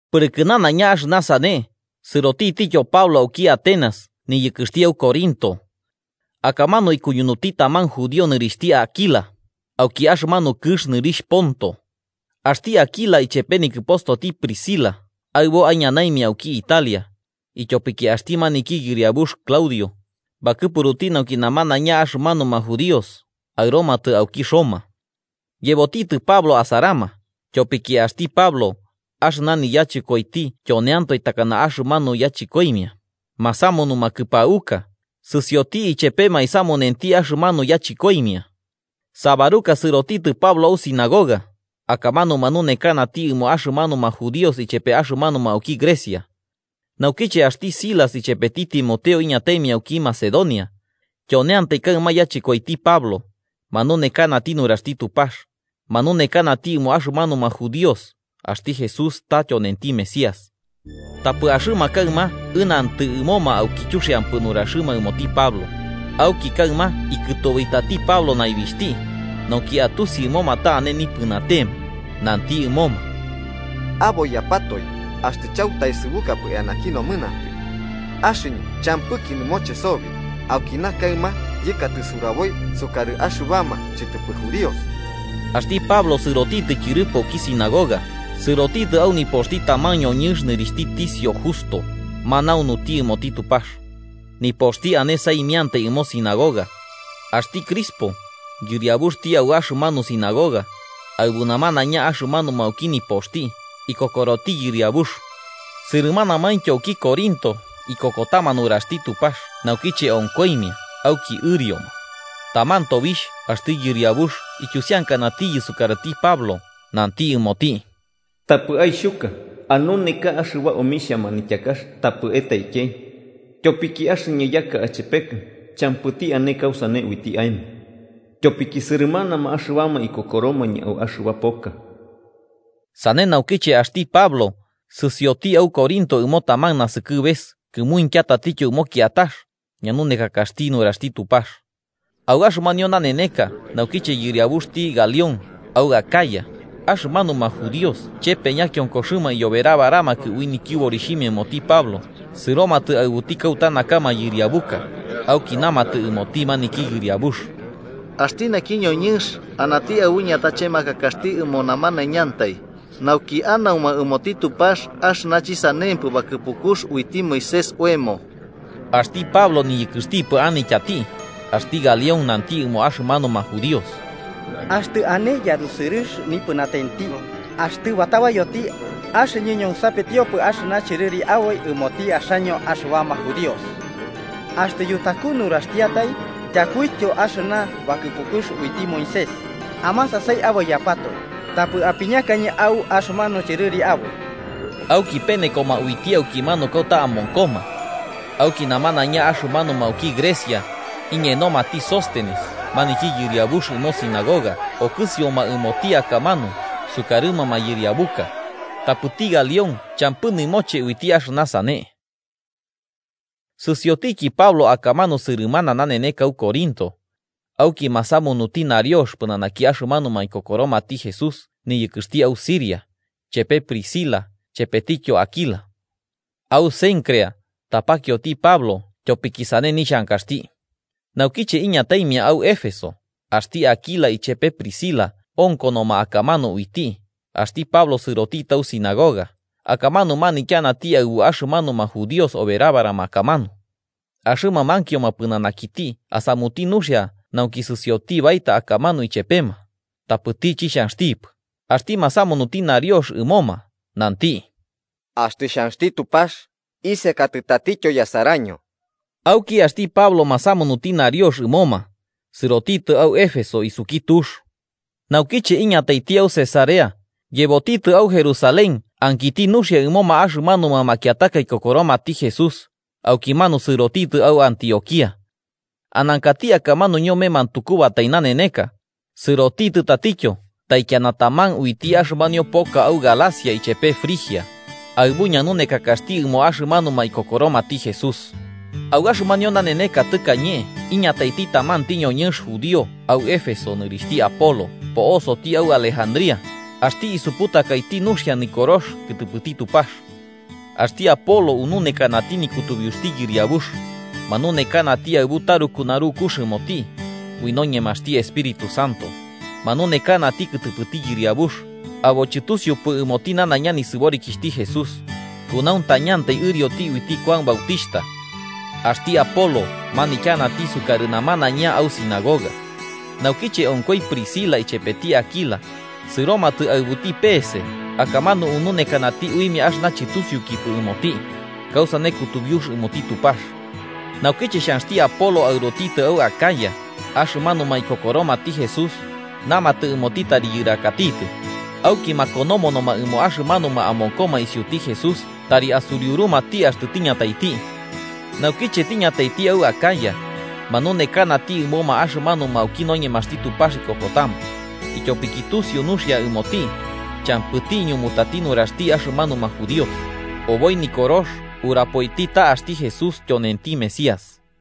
Pɨrɨkɨ nanaiña axɨna sane, sɨrotitityo Pablo auki Atenas niyɨkɨxti au Corinto. Akamanu ikuñunuti taman judío nɨrixhti Áquila, auki axɨmanu kɨx nɨrixh Ponto. Axti Áquila ichepe nikɨpostoti Priscila aɨbo aiñanaimia auki Italia, ityopiki axti maniki yɨriabux Claudio, bakɨpuruti nauki namanaiña axɨmanuma judíos aɨromatɨ auki Roma. Yebotitɨ Pablo asarama, tyopiki axti Pablo, axɨna niyachɨkoiti tyoneantoe takana axɨmanu yachɨkoimia, masamunuma kɨpauka, sɨsioti ichepema aisamunenti axɨmanu yachɨkoimia. Sábaruka sɨrotitɨ Pablo au sinagoga, akamanu manunekanati ɨmo axɨmanuma judíos ichepe axɨmanuma auki Grecia. Naukiche axti Silas ichepeti Timoteo iñataimia auki Macedonia, tyoneantai kaɨma yachɨkoiti Pablo, manunekanati nuraxti Tupax, manunekanati ɨmo axɨmanuma judíos axti Jesús ta tyonenti Mesías. Tapɨ axɨma kaɨma ɨnantɨ ɨmoma auki chuxiampɨ nuraxɨma ɨmoti Pablo. Auki kaɨma ikɨtobitati Pablo naibixhti, nauki atusi ɨmoma ta ane nipɨnatema, nanti ɨmoma: –Aboiyapatoe axtɨ chautaesɨbukapɨ eanaki nomɨnantɨ. Axɨñɨ champɨki nɨmoche sobi. Aukina kaɨma yɨkatɨ suraboi sukarɨ axɨbama chɨtɨpɨ judíos. Axti Pablo sɨrotitɨ tyɨrɨpo auki sinagoga, sɨrotitɨ au nipoxti taman ñoñɨnx nɨrixhti Ticio Justo, manaunuti ɨmoti Tupax. Nipoxti ane saimiantai ɨmo sinagoga. Axti Crispo, yɨriabuxti au axɨmanu sinagoga, aɨbu namanaiña axɨmanuma auki nipoxti, ikokoroti Yɨriabux. Sɨrɨmanamaintyo auki Corinto, ikokotama nuraxti Tupax naukiche onkoimia auki ɨrioma. Taman tobixh axti Yɨriabux ityusiankanatiyɨ sukarɨti Pablo nanti ɨmoti: “Tapɨ aixhuka. Anuneka axɨba omixhia manityakax tapɨ etaikei. Tyopiki axɨñɨ yaka achepekɨ champɨti ane kausane uiti aemo, tyopiki sɨrɨmanama axɨbama ikokoromañɨ au axɨba poka.” Sane naukiche axti Pablo sɨsioti au Corinto ɨmo taman nasɨkɨbes kɨmuintya tatityo ɨmo kiatax, ñanunekakaxti nuraxti Tupax. Au axɨmanio naneneka naukiche yɨriabuxti Galión au Acaya, axɨmanuma judíos chepe ñakionkoxɨma iyoberabaramakɨ ui nityɨborixhimia ɨmoti Pablo, sɨromatɨ aɨbuti kauta naka mayɨriabuka, auki namatɨ ɨmoti maniki yɨriabux: –Axti naki ñoñɨnx anati aɨbu ñatachemakakaxti ɨmo namanaiñantai, nauki anauma ɨmoti Tupax axɨna chɨsanempɨ bakɨpukux uiti Moisés oemo. Axti Pablo tɨniyɨkɨxɨpɨ anityati, axti Galión nanti ɨmo axɨmanuma judíos: –Axtɨ ane yarusɨrɨx nipɨnatenti, axtɨ batabayoti, axɨñɨ ñonsapetiopɨ axɨna chɨrɨri aboi ɨmoti axaño axɨbama judíos. Axtɨ yutaku nuraxtiatai, tyakuityo axɨna bakɨpukux uiti Moisés, amasasai aboiyapatoe, tapɨ apiñakañɨ au axɨmanu chɨrɨri aboi. Auki penekoma uiti aukimanu kauta amonkoma. Auki namanaiña axɨmanuma auki Grecia, iñenomati Sóstenes maniki yɨriabux ɨmo sinagoga okɨsioma ɨmoti akamanu sukarɨma mayɨriabuka. Tapɨti Galión champɨ nɨmoche uiti axɨna sane. Sɨsiotiki Pablo akamanu sɨrɨmana naneneka au Corinto. Auki masamunuti nariox pɨnanaki axɨmanuma ikokoromati Jesús niyɨkɨxti au Siria, chepe Priscila chepetityo Áquila. Au Cencrea, tapakioti Pablo tyopiki sane nixhankaxti. Naukiche iñataimia au Éfeso, axti Áquila ichepe Priscila onkonoma akamanu uiti, axti Pablo sɨrotitɨ au sinagoga, akamanu manityanati aɨbu axɨmanuma judíos oberabarama akamanu. Axɨma mankioma pɨnanakiti asamuti nuxia nauki sɨsiotiki baeta akamanu ichepema, tapɨti chixhanxtipɨ, axti masamunuti nariox ɨmoma, nanti: “Axtɨ xhanxti Tupax, isekatɨ tatityo yasaraño.” Auki axti Pablo masamunuti nariox ɨomoma, sɨrotitɨ au Éfeso isuki tux. Naukiche iñataiti au Cesarea, yebotitɨ au Jerusalén ankiti nuxia ɨmoma axɨmanuma makiataka ikokoromati Jesús, aukimanu sɨrotitɨ au Antioquía. Anankati akamanu ñome mantukubatai naneneka, sɨrotitɨ tatityo taikiana taman uiti axɨmanio poka au Galacia ichepe Frigia, aɨbu ñanunekakaxti ɨmoma axɨmanuma ikokoromati Jesús. Au axɨmanio naneneka tɨkañe iñataiti tamanti ñoñɨnx judío au Éfeso nɨrixhti Apolo po'osoti au Alejandría, axti isuputakati nuxia Nikorox kɨtɨpɨti Tupax. Axti Apolo ununekanati nikutubiuxti Yɨriabux, manunekanati aɨbu taruku narukux ɨmoti, ui noñemaxti Espíritu Santo, manunekanati kɨtɨpɨti Yɨriabux, abo chɨtusiupɨ ɨmoti nanaiña nisɨborikixhti Jesús, kunauntañantai ɨrioti uiti Kuan Bautixhta. Axti Apolo manityanati sukarɨ namanaiña au sinagoga. Naukiche onkoi Priscila ichepeti Áquila, sɨromatɨ aɨbuti peese akamanu ununekanati uimia axɨna chɨtusiukipɨ ɨmoti, kausane kutubiux ɨmoti Tupax. Naukiche xhanxti Apolo aɨrotitɨ au Acaya, axɨmanuma ikokoromati Jesús, namatɨ ɨmoti tari yɨrakatitɨ, auki makonomonoma ɨmo axɨmanuma amonkoma isiuti Jesús tari asuriurumati axtɨ tiñataiti. Naukiche tiñataiti au Acaya, manunekanati ɨmoma axɨmanuma auki noñemaxti Tupax ikokotama, ityopiki tusiu nuxia ɨmoti, champɨti iñumutati nuraxti axɨmanuma judíos, oboi Nikorox urapoiti ta axti Jesús tyonenti Mesías.